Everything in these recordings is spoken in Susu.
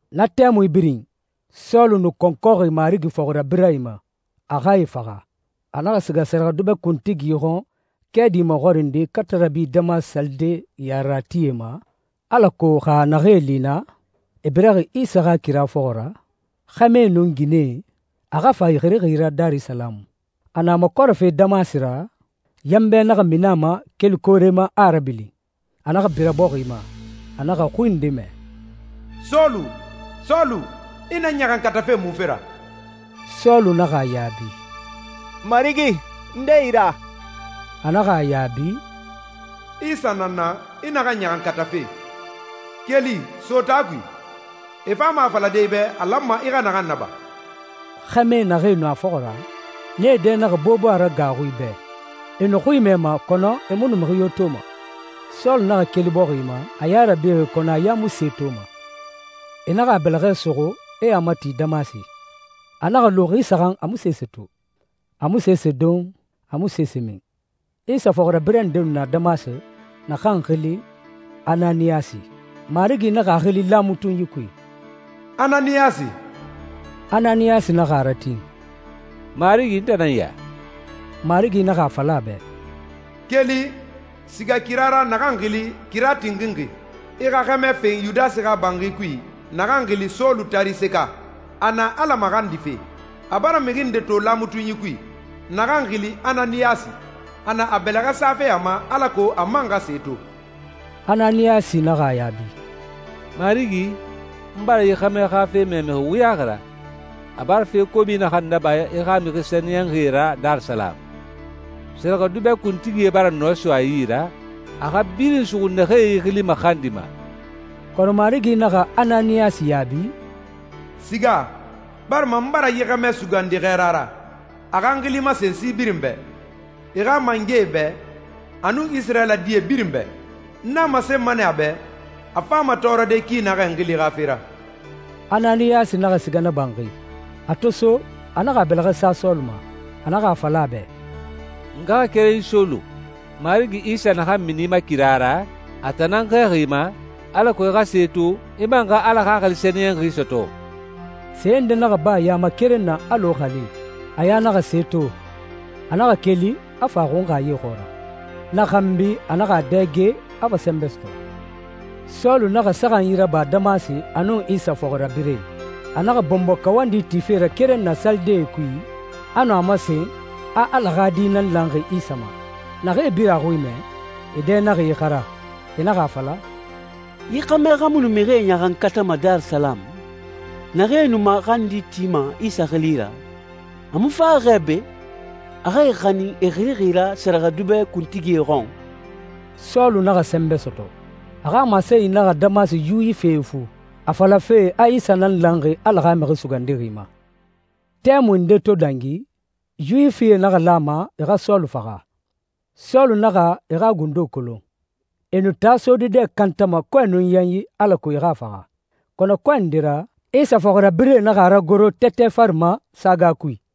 Na tɛmui birin, Sɔlu nu kɔnkɔxi Marigi fɔxirabirɛe ma, a xa e faxa. A naxa siga sɛrɛxɛdubɛ kuntigi xɔn kɛɛdi maxɔrinde katarabi Damasi salide yareratie ma, alako xa a naxee li naa, e biraxi Isa xa kira fɔxɔ ra, xɛmɛe nun ginɛe, a xa fa e xirixi ra Darisalamu. A na makɔrɛfe Damasi ra, yanbɛ naxa mini a ma keli koore ma, a a rabilin. A naxa bira bɔxi ma, a naxa xui nde mɛ, «Sɔlu, Sɔlu, i na n ɲaxankatafe munfe ra?» Sɔlu naxa a yaabi, «Marigi, nde i ra?» A naxa a yaabi, «Isa nan n na, i naxan ɲaxankatafe. Keli, so taa kui, e fama a falade i bɛ a lanma i xa naxan naba.» Xɛmɛe naxee nu a fɔxɔ ra, nee dɛ naxa bobo a ra gaaxui bɛ. E nu xui mɛma, kɔnɔ e mu nu mixi yo toma. Sɔlu naxa keli bɔxi ma, a ya rabixi, kɔnɔ a ya mu se toma. E naxa a bɛlɛxɛ suxu, e a mati Damasi. A naxa lu xi saxan a mu sese to, a mu sese don, a mu sese min. Isa fɔxirabirɛ nde nu na Damasi, naxan xili Ananiyasi. Marigi naxa a xili laamatunyi kui, «Ananiyasi!» Ananiyasi naxa a ratin, «Marigi, n tan nan ya.» Marigi naxa a fala a bɛ, «Keli, siga kira ra naxan xili ‹Kira Tinxinxi›, i xa xɛmɛ fen Yudasi xa banxi kui, naxan xili Sɔlu Tariseka. A na Ala maxandife. A bara mixi nde to laamatunyi kui, naxan xili Ananiyasi, a na a bɛlɛxɛ safe a ma alako a man xa se to.» Ananiyasi naxa a yaabi, «Marigi, n bara yi xɛmɛ xa fe mɛ mixi wuyaxi ra, a bara fe kobi naxan naba i xa mixi sɛniyɛnxie ra Darisalamu. Sɛrɛxɛdubɛ kuntigie bara nɔɛ so a yi ra, a xa birin suxu naxee i xili maxandima.» Kɔnɔ Marigi naxa Ananiyasi yaabi, «Siga, barima n bara yi xɛmɛ sugandi xɛɛra ra, a xa n xili masen si birin bɛ, e xa mangɛe bɛ, a nun Isirayila die birin bɛ. N a masenma nɛ a bɛ, a fama tɔɔrɔde ki naxɛ n xili xa fe ra.» Ananiyasi naxa siga na banxi. A to so, a naxa a bɛlɛxɛ sa Sɔlu ma. A naxa a fala a bɛ, «N ngaxakerenyi Sɔlu, Marigi Isa naxan mini i ma kira ra, a tan nan n xɛɛxi i ma, alako i xa se to, i man xa Ala Xaxili Sɛniyɛnxi sɔtɔ.» Se nde naxa ba a ya ma keren na alɔ xalee, a ya naxa se to. A naxa keli, a fa a xunxa ye xɔɔra. Na xanbi a naxa a dɛge, a fa sɛnbɛ sɔtɔ. Sɔlu naxa saxanyi raba Damasi a nun Isa fɔxirabirɛe. A naxa bɔnbɔ kawandi tife ra keren na salidee kui a nu a masen a Ala xa Di nan lanxi Isa ma. Naxee birin a xui mɛ, e dɛ naxa ixara. E naxa a fala, «Yi xɛmɛ xa mu nu mixie ɲaxankatama Darisalamu, naxee nu maxandi tima Isa xili ra? A mu faxi xɛ be, a xa e xanin e xirixi ra sɛrɛxɛdubɛ kuntigie xɔn?» Sɔlu naxa sɛnbɛ sɔtɔ. A xa masenyi naxa Damasi Yuwifie ifu, a falafe a Isa nan lanxi Ala xa Mixi Sugandixi ma. Tɛmui nde to dangi, Yuwifie naxa lan a ma e xa Sɔlu faxa. Sɔlu naxa e xa gundo kolon. E nu taa sode dɛ kantama kɔɛ nun yanyi alako e xa a faxa. Kɔnɔ kɔɛ nde ra, Isa fɔxirabirɛe naxa a ragoro tɛtɛ fari ma saga kui.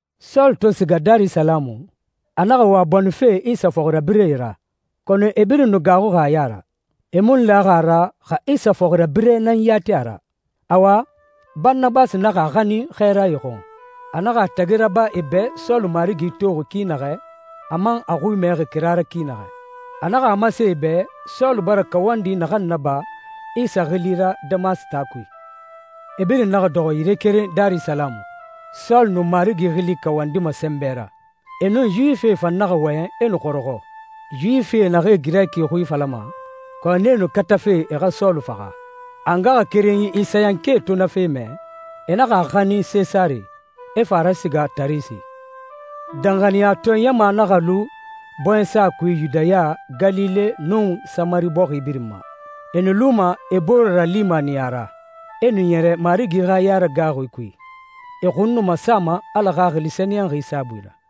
Sɔlu to siga Darisalamu, a naxa wa bonife Isa fɔxirabirɛe ra, kɔnɔ e birin nu gaaxuxi a ya ra. E mu nu laxi a ra xa Isa fɔxirabirɛ nan yati a ra. Awa, Baranabasi naxa a xanin xɛɛrae xɔn. A naxa a tagi raba e bɛ Sɔlu Marigi toxi ki naxɛ, a man a xui mɛxi kira ra ki naxɛ. A naxa a masen e bɛ Sɔlu bara kawandi naxan naba Isa xili ra Damasi taa kui. E birin naxa dɔxɔ yire keren Darisalamu. Sɔlu nu Marigi xili kawandima sɛnbɛ ra. E nun Yuwifie fan naxa wɔyɛn e nu xɔrɔxɔ, Yuwifi naxee Girɛki xui falama, kɔnɔ nee nu katafe e xa Sɔlu faxa. A ngaxakerenyi Isayankae to na fe mɛ, e naxa a xanin Sesare, e fa a rasiga Tarise. Danxaniyatɔɛ ɲama naxa lu bɔɲɛsa kui Yudaya, Galile, nun Samari bɔxi birin ma. E nu luma e bore ralimaniya ra, e nu e ɲɛrɛ Marigi xa yaragaaxui kui. E xun nu masama Ala Xaxili Sɛniyɛnxi saabui ra.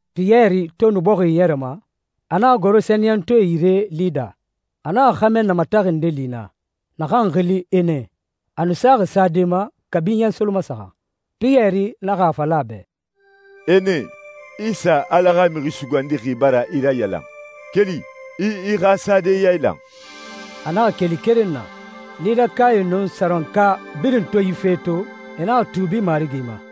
Piyɛri to nu bɔxi iɲɛrɛma, a naxa goro sɛniyɛntɔɛe yire Lida. A naxa xɛmɛ namataxi nde li naa, naxan xili Ene, a nu saxi sade ma kabi ɲɛ solomasaxan. Piyɛri naxa a fala a bɛ, «Ene, Isa Ala xa Mixi Sugandixi bara i rayalan. Keli, i i xa sade yailan.» A naxa keli keren na. Lidakae nun Sarɔnka birin to yi fe to, e naxa tuubi Marigi ma.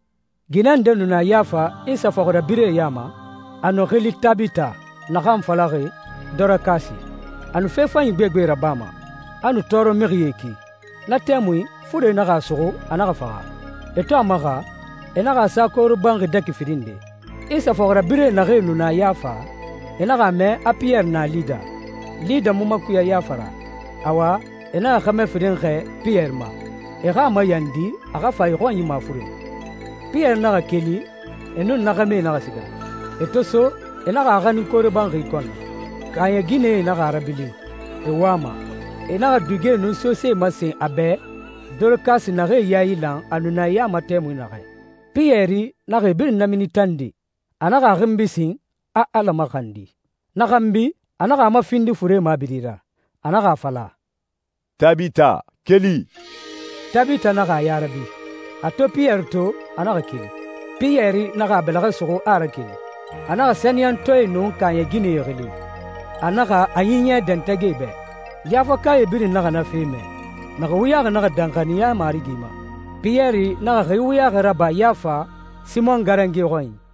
Ginɛ nde nu na Yafa Isa fɔxirabirɛe ya ma. A nu xili Tabita, naxan falaxi Dɔrakasi. A nu fe fanyi gbegbe rabama, a nu tɔɔrɔmixie ki. Na tɛmui, fure naxa a suxu, a naxa faxa. E to a maxa, e naxa a sa koore banxi dɛki firin nde. Isa fɔxirabirɛe naxee nu na Yafa, e naxa a mɛ a Piyɛri na Lida. Lida mu makuya Yafa ra. Awa, e naxa xɛmɛ firin xɛɛ Piyɛri ma, e xa a mayandi a xa fa e xɔnyi mafuren. Piyɛri naxa keli, e nun na xɛmɛe naxa siga. E to so, e naxa a xanin koore banxi kɔn na. Kaaɲɛ ginɛe naxa a rabilin, e wama. E naxa dugie nun sosee masen a bɛ Dɔrakasi naxee yailan a nu na e ya ma tɛmui naxɛ. Piyɛri naxa e birin namini tande. A naxa a xinbi sin, a Ala maxandi. Na xanbi, a naxa a mafindi fure mabiri ra. A naxa a fala, «Tabita, keli.» Tabita naxa a ya rabi. A to Piyɛri to, a naxa keli. Piyɛri naxa a bɛlɛxɛ suxu, a a rakeli. A naxa sɛniyɛntɔɛe nun kaaɲɛ ginɛe xili. A naxa a ɲiɲɛ dɛntɛgɛ e bɛ. Yafakae birin naxa na fe mɛ. Mixi wuyaxi naxa danxaniya Marigi ma. Piyɛri naxa xi wuyaxi raba Yafa, Simɔn garange xɔnyi.